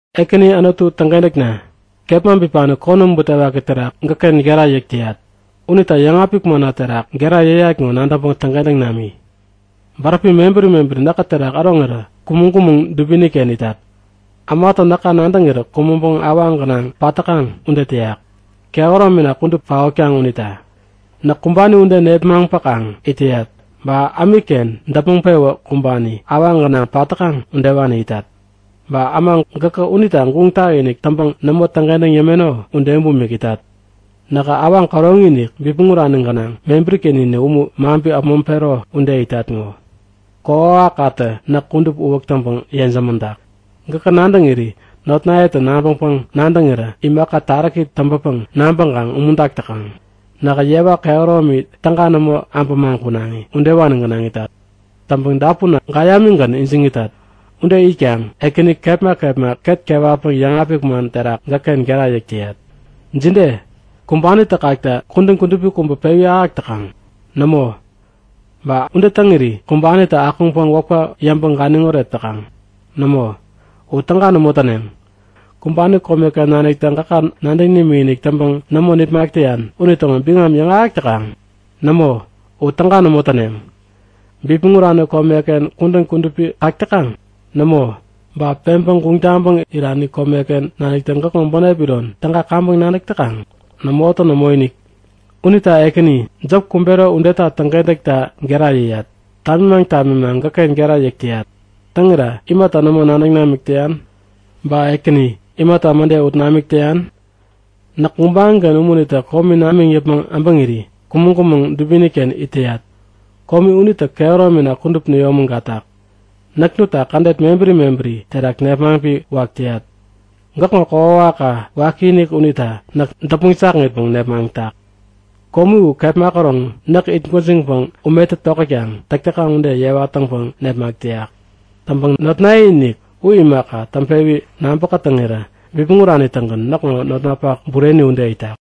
Ekäni Anutu täŋkentäkna, kepma bipani konäm butewaki terak gäkken gera yäk täyat. Unita yäŋapik manna terak gera yäyat ŋo nadäŋpäŋ täŋkentäŋ nami. Bäräpi mebäri mebäri näkä terak äroŋirä kumäŋ-kumäŋ dubiniken itat. Ämatä näka nadäŋirä kumäŋpäŋ awaŋ gänaŋ pat täkaŋ ude täyak, kehäromina kudup paotkaŋ unita. Näk kumbani ude nepmaŋpäkaŋ it täyat. Ba ämikken däpmäŋ-pewä kumbani, awaŋ gänaŋ pat täkaŋ udewani itat. Ba äma gäkä unita guŋ tak-inik täŋpäŋ nämo täŋkentäŋ yämeno ude bumik itat. Nähä awaŋ käroŋi-inik bipmäŋ urani gänaŋ mebäri-ken-inik umu maŋpi äpmoŋpero ude itat ŋo! Kokwawakkatä näk kudup uwäk täŋpäŋ yejämäŋtak. Gäkä nadäŋiri notnayetä nabäŋpäŋ-nadäŋirä imaka taräki täŋpäpäŋ nabäŋkaŋ umuntak täkaŋ. Näk yewa kehäromi täga nämo abämaŋ kunaŋi, udewani gänaŋ itat. Täŋpäŋ dapunna gäyamigän ijiŋ itat. Ude itkaŋ, Ekäni, kepma kepma ketna kewatpäŋ yäŋapik man terak gäkken gera yäk täyat. Jide? Kumbanitä kakta kudän kudupi pewi ahäk täkaŋ? Nämo! Ba ude täŋiri kumbanitä akuŋpäŋ wäpka yäŋpäŋ ganiŋoret täkaŋ? Nämo, u täga nämo täneŋ! Kumbani komeken naniktä gäkä nadäŋ nimikinik täŋpäŋ nämo nipmak täyan unitäŋo biŋam yäŋahäk täkaŋ? Nämo, u täga nämo täneŋ! Bipmäŋ urani kome uken kudän kudupi kak täkaŋ? Nämo! Ba peŋpäŋ guŋ taŋpäŋ irani kome udeken naniktä gäkŋo bänep iron täga kaŋpäŋ nadäk täkaŋ? Nämotä nämoinik! Unita Ekäni, jop kumbero udeta täŋkentäkta gera yäyat. Tamimaŋ tamimaŋ gäkken gera yäk täyat. Täŋira imata nämo nadäŋ namik täyan? Ba Ekäni, imata mäde ut namik täyan? Näk gubaŋiken umunitä komi namiŋ yäpmäŋ äbäŋiri kumäŋ-kumäŋ dubiniken it täyat. Komi unitä kehäromina kudup näyomägatak. Näk nutta kädet mebäri mebäri terak nepmaŋpi wak täyat. Gäkŋo kokwawakka wakiinik unitä näk däpmäŋ jakŋitpäŋ nepmaŋtak. Komi u kepma käroŋ näk itgwäjiŋpäŋ umetä tokätkaŋ täk täkaŋ ude yewa täŋpäŋ nepmak täyak. Täŋpäŋ notnaye-inik u imaka, täŋpewi nabä-kätäŋirä bipmäŋ urani-tägän näkŋo notnapak bureni ude itak.